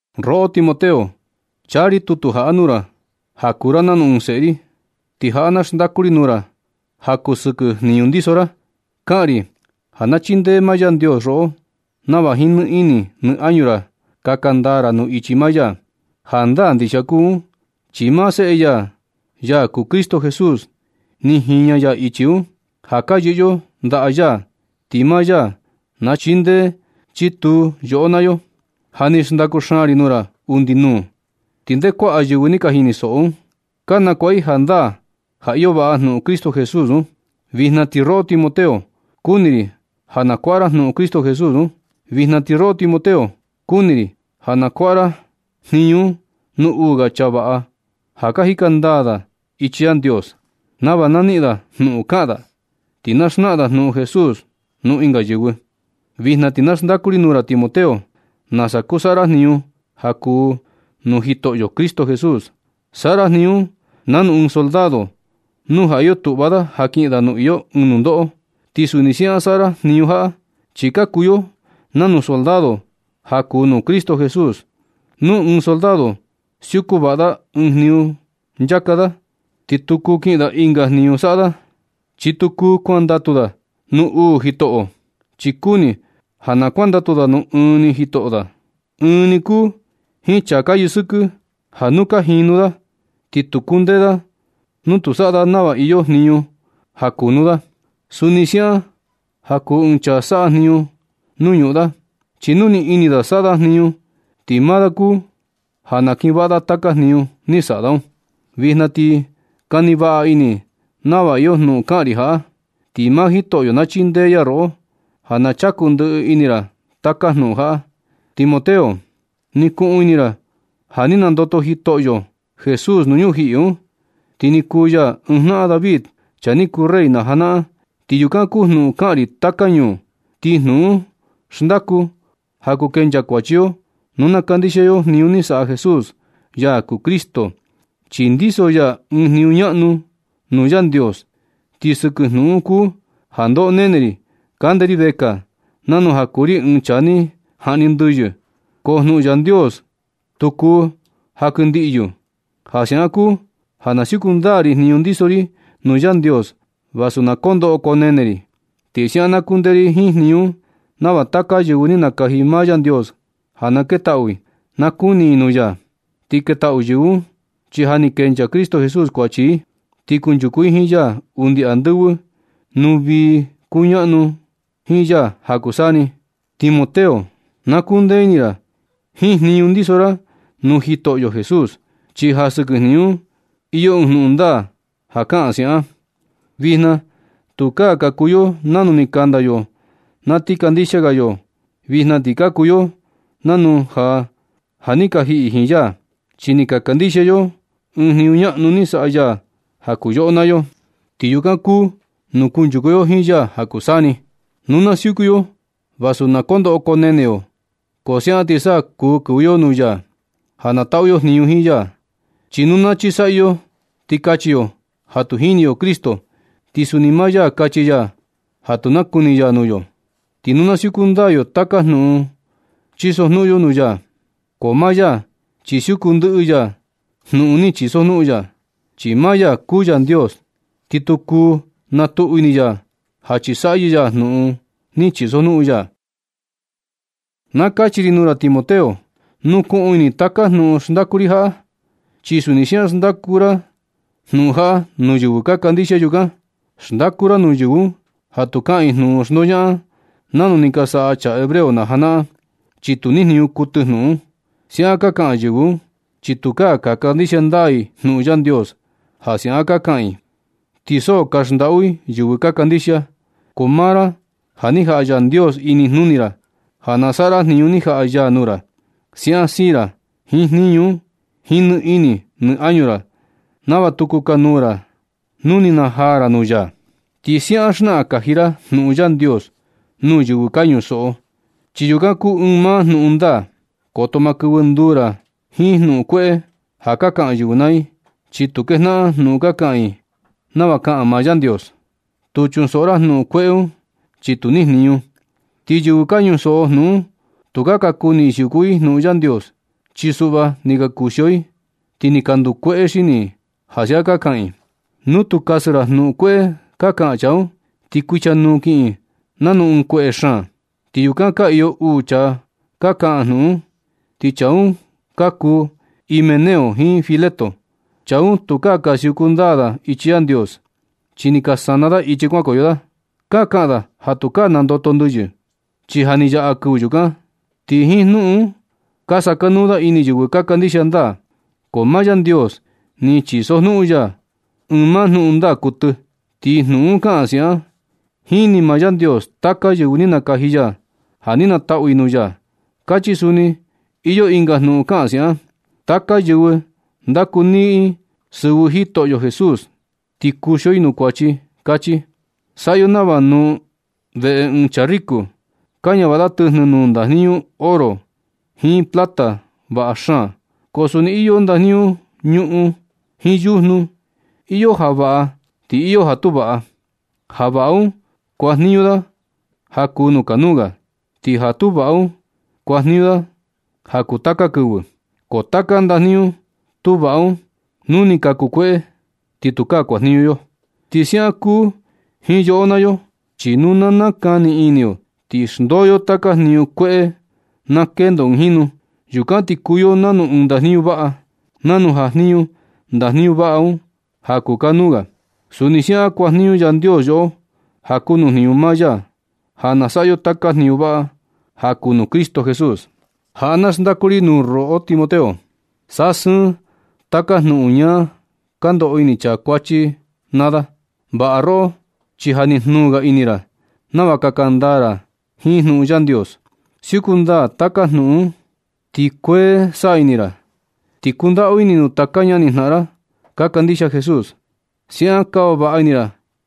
Roꞌo Timoteo, chaa ri tutu jaꞌa nuu ra ja kuu ra nanu ɨɨn seꞌe ri. Ti jaꞌa na xndaku ri nuu ra ja kuu sɨkɨ jniñu kundiso ra. Kaꞌan ri ja na chindee maa Yandios roꞌo nava jiin nɨ ini nɨ añu ra kaka ndaa ra nuu ichi maa ya. Jandaa ndixia kuu un, chi maa seꞌe ya, ya kuu Cristo Jesús, ni jiña ya ichi un. Ja ka yɨꞌɨ yo ndaꞌa ya ti maa ya na chindee chituu yoꞌo naa yo. Ja ni xndaku xaan ri nuu ra undi nuu, ti nde kuaꞌa yɨvɨ ni ka jinisoꞌo un, ka nakuaꞌa i jandaa ja iyo vaꞌa jnuꞌun Cristo Jesús un. Vijna ti roꞌo Timoteo, kuni ri ja na kuaꞌa ra jnuꞌun Cristo Jesús un. Vijna ti roꞌo Timoteo, kuni ri ja na kuaꞌa ra jniñu un nuu uu ga chaa vaꞌa, ja ka jika ndaa ichi Yandios, nava na niꞌin da jnuꞌun kaꞌan da, ti na xnaꞌan da jnuꞌun Jesús nuu ɨnga yɨvɨ. Vijna ti na xndaku ri nuu ra Timoteo nasa kuu saꞌa ra jniñu ja kuu nuu Jitoꞌo Cristo Jesús. Saꞌa ra jniñu un nanu ɨɨn soldado nu ja iyo tuꞌva da ja kiꞌin da nuu iyo ɨɨn nundoꞌo. Ti suni siaꞌan saꞌa ra jniñu jaꞌa, chi ka kuu yo nanu soldado ja kuu nuu Cristo Jesús. Nu ɨɨn soldado siuku vaꞌa da ɨɨn jniñu nchaa da, ti tu kuu kiꞌin da ɨnga jniñu saꞌa da. Chi tu kuu kuandatu da nuu uu jitoꞌo, chi kuni ja na kuandatu da nuu ɨɨn ni jitoꞌo da. Ɨɨn ni kuu jiin chaa ka yɨsɨkɨ, ja nu da ka jinu, ti tu kundee da nu tu saꞌa da nava iyo jniñu ja kuu kunu da un. Suni siaꞌan ja kuu ɨɨn chaa saꞌa jniñu nuu ñuꞌun da, chi nu nɨ ini da na saꞌa da jniñu, ti maa da kuu ja na kiꞌin vaꞌa taka jniñu ni saꞌa da un. Vijna ti kani vaꞌa ini nava iyo jnuꞌun kaꞌan ri jaꞌa, ti maa Jitoꞌo na chindee ya roꞌo ja na chaku ndɨꞌɨ ini ra taka jnuꞌun jaꞌa. Timoteo, ni kuꞌun ini ra ja ni nandoto Jitoꞌo Jesús nuu ñujiꞌi un. Ti ni kuu ya ɨɨn jnaꞌan David, chaa ni kuu rey na janaꞌan. Ti yukan kuu jnuꞌun kaꞌan ri taka ñuu, ti jnuꞌun un xndaku ja kuu kenchaa kuachi yo nu na kandixia yo jniñu ni saꞌa Jesús, ya kuu Cristo, chi ndiso ya ɨɨn jniñu ñaꞌnu un nuu Yandios. Ti sɨkɨ jnuꞌun un kuu ja ndoꞌo nene ri kande ri vekaa nanu ja kuu ri ɨɨn chaa ni jaꞌni ndɨyɨ, ko jnuꞌun Yandios tu kuu jankɨndiꞌyu. Ja siaꞌan kuu ja na siuku ndaa ri jniñu ndiso ri nuu Yandios vasu na koo ndoꞌo koo nene ri. Ti siaꞌan na kundee ri jiin jniñu un nava taka yɨvɨ ni nakaji maa Yandios ja na ketaꞌu i, na kuni i jnuꞌun ya. Ti ketaꞌu yɨvɨ un, chi ja ni kenchaa Cristo Jesús kuachi i, ti kunchuku i jiin ya undi andɨvɨ nuu vii kuñaꞌnu i jiin ya ja kuu saa ni. Timoteo, na kuu ndee ini ra jiin jniñu ndiso ra nuu Jitoꞌo Jesús, chi ja sɨkɨ jniñu un ti iyo ɨɨn jnuꞌun ndaa ja kaꞌan siaꞌan: Vijna tukaa ka kuu yo nanu ni kanda yo na ti kandixia ga yo. Vijna ti ka kuu yo nanu ja ja ni ka jiꞌi jiin ya, chi ni ka kandixia yo ɨɨn jniñu ñaꞌnu ni saꞌa ya ja kuu yoꞌo naa yo. Ti yukan kuu nuu kunchuku yo jiin ya ja kuu saa ni. Nu na siuku yo vasu na koo ndoꞌo koo nene yo, ko siaꞌan ti sa kuu kɨvɨ yo nuu ya ja na taꞌu yo jniñu jiin ya. Chi nu na chisaꞌyɨ yo ti kachi yo ja tu jini yo Cristo, ti suni maa ya kachi ya ja tu nakuni ya nuu yo. Ti nu tu siuku ndaa yo taka jnuꞌun chisojnuꞌun yo nuu ya, ko maa ya chi siuku ndɨꞌɨ ya jnuꞌun ni chisojnuꞌun ya, chi maa ya kuu Yandios, ti tu kuu na tuꞌu ini ya ja chisaꞌyɨ ya jnuꞌun ni chisojnuꞌun ya. Na kachi ri nuu ra Timoteo, nukuꞌun ini taka jnuꞌun xndaku ri jaꞌa. Ti suni siaꞌan xndaku ra jnuꞌun jaꞌa nuu yɨvɨ ka kandixia yukan. Xndaku ra nuu yɨvɨ un ja tu kaꞌan i jnuꞌun xndoñaꞌan nanu ni ka saꞌa chaa hebreo na janaꞌan, chi tu nijniñu kuɨtɨ jnuꞌun un. Siaꞌan ka kaꞌan yɨvɨ un, chi tukaa ka kandixia ndaa i jnuꞌun Yandios ja siaꞌan ka kaꞌan i, ti so ka xndaꞌu i yɨvɨ ka kandixia. Ko maa ra, ja ni jaꞌa Yandios inijnuni ra ja na saꞌa ra jniñu ni jaꞌa ya nuu ra. Siaꞌan siin ra jiin jniñu un jiin nɨ ini nɨ añu ra nava tu kukanuu ra nu ni najaa ra nuu ya. Ti siaꞌan xnaꞌan kaji ra jnuꞌun Yandios nuu yɨvɨ ka ñusoꞌo, chi yukan kuu ɨɨn maa jnuꞌun ndaa. Koto ma kɨvɨ nduu ra jiin jnuꞌun kueꞌe ja ka kaꞌan yɨvɨ naa i, chi tu kejnaꞌan jnuꞌun ka kaꞌan i nava kaꞌan maa Yandios. Tu chunsoꞌo ra jnuꞌun kueꞌe un chi ni tu nijniñu. Ti yɨvɨ ka ñusoꞌo jnuꞌun un tukaa ka kuni i siuku i jnuꞌun Yandios, chi suꞌva ni ka kuxio i, ti ni ka ndukueꞌe xini i ja siaꞌan ka kaꞌan i. Nu tu kasɨ ra jnuꞌun kueꞌe ka kaꞌan chaa un, ti kuichanuu kiꞌin nanu ɨɨn kueꞌe xaan. Ti yukan ka iyo uu chaa ka kaꞌan jnuꞌun un, ti chaa un ka kuu Himeneo jiin Fileto. Chaa un tukaa ka siuku ndaa da ichi Yandios, chi ni ka sana da ichi kuankoyo da. Ka kaꞌan da ja tukaa nandoto ndɨyɨ, chi ja ni yaꞌa kɨvɨ yukan. Ti jiin jnuꞌun un ka sakanuu da ini yɨvɨ ka kandixia ndaa. Ko maa Yandios ni chisojnuꞌun ya ɨɨn maa jnuꞌun ndaa kuɨtɨ. Ti jnuꞌun un kaꞌan siaꞌan: “Jini maa Yandios taka yɨvɨ ni nakaji ya ja na nanitaꞌu i nuu ya”, kachi. Suni iyo ɨnga jnuꞌun kaꞌan siaꞌan: “Taka yɨvɨ ndakuniꞌin sɨvɨ Jitoꞌo Jesús, ti kuxio i nuu kuachi”, kachi. Saꞌa yo nava nuu veꞌe ɨɨn chaa riku, ka ñavaꞌa da tɨjnɨ nuu ndajniñu oro jiin plata vaꞌa xaan, ko suni iyo ndajniñu ñuꞌun jiin yujnu, iyo ja vaꞌa ti iyo ja tu vaꞌa. Ja vaꞌa un kuajniñu da ja kuu nuu kanuu ga, ti ja tu vaꞌa un kuajniñu da ja kuu taka kɨvɨ. Ko taka ndajniñu tu vaꞌa un nu ni ka kukueꞌe ni ti tukaa kuajniñu yo. Ti siaꞌan kuu jiin yoꞌo naa yo, chi nu na nakani ini yo ti xndoo yo taka jniñu kueꞌe un na kendo ɨɨn jinu. Yukan ti kuu yo nanu ɨɨn ndajniñu vaꞌa. Nanu jajniñu ndajniñu vaꞌa un ja kuu kanuu ga, suni siaꞌan kuajniñu Yandios yoꞌo ja kuu nuu jniñu maa ya, ja na saꞌa yo taka jniñu vaꞌa ja kuu nuu Jitoꞌo Cristo Jesús. Jaꞌa na xndaku ri nuu ra roꞌo Timoteo. Saꞌa sɨɨ taka jnuꞌun ñaa ka ndoꞌo ini chaa kuachi naa da. Vaꞌa roꞌo, chi ja ni jnuu ga ini ra nava kaka ndaa ra jiin jnuꞌun Yandios. Siuku ndaa taka jnuꞌun un ti sa kuee koo ini ra, ti kundaꞌu ini nuu taka ñani jnaꞌan ra ka kandixia Jesús. Siaꞌan kava vaꞌa ini ra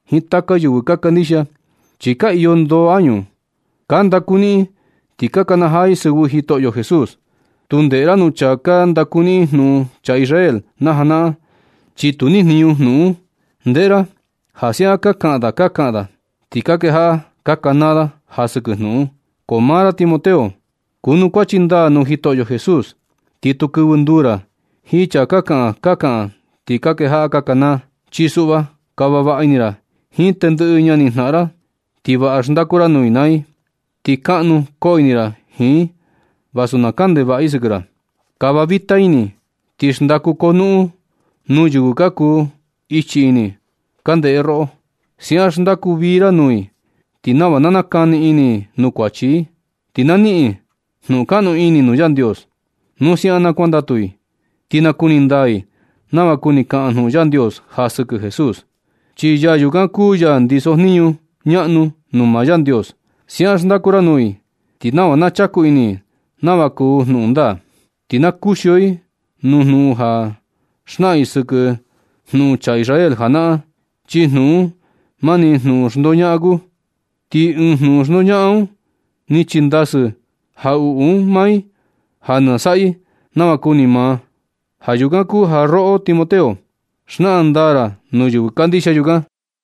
jiin taka yɨvɨ ka kandixia, chi ka iyo ndoo añu i ka ndakuniꞌin i ti ka kanajaa i sɨvɨ Jitoꞌo Jesús. Tu ndeꞌe ra nuu chaa ka ndakuniꞌin jnuꞌun chaa Israel na janaꞌan, chi tu nijniñu kuɨtɨ jnuꞌun un. Ndeꞌe ra ja siaꞌan ka kaꞌan ka kaꞌan da, ti ka kejaꞌa ka kanaa da ja sɨkɨ jnuꞌun un. Ko maa ra Timoteo, kuanukuachi ndaa nuu Jitoꞌo Jesús, ti tu kɨvɨ nduu ra jiin chaa ka kaꞌan ka kaꞌan ti ka kejaꞌa kanaa un. Chi suꞌva, kava vaꞌa ini ra jiin tendɨꞌɨ ñani jnaꞌan ra ti vaꞌa xndaku ra nuu i naa i. Ti kaꞌnu koo ini ra jiin i vasu na kaꞌan ndevaꞌa i sɨkɨ ra. Kava vita ini ti xndaku konuꞌun nuu yɨvɨ ka kuu ichi ini ka ndeꞌe roꞌo. Siaꞌan xndaku vii ra nuu i, ti nava na nakani ini i nuu kuachi i, ti na niꞌin i jnuꞌun kaꞌnu ini nuu Yandios. Nu siaꞌan na kuandatu i, ti nakuni ndaa i nava kuni kaꞌan jnuꞌun Yandios ja sɨkɨ Jesús, chi yaa yukan kuu ya ndiso jniñu ñaꞌnu nuu maa Yandios. Siaꞌan xndaku ra nuu i, ti nava na chaku ini i nava kuu jnuꞌun ndaa. Ti na kuxio i nuu jnuꞌun ka xnaꞌan i sɨkɨ jnuꞌun chaa Israel janaꞌan, chi jnuꞌun un mani jnuꞌun xndoñaꞌan kuu. Ti jiin jnuꞌun xndoñaꞌan un ni chindasɨ jaꞌuꞌu un maa i ja na saꞌa i nava kuni maa. Ja yukan kuu ja roꞌo Timoteo, xnaꞌan ndaa nuu yɨvɨ kandixia yukan.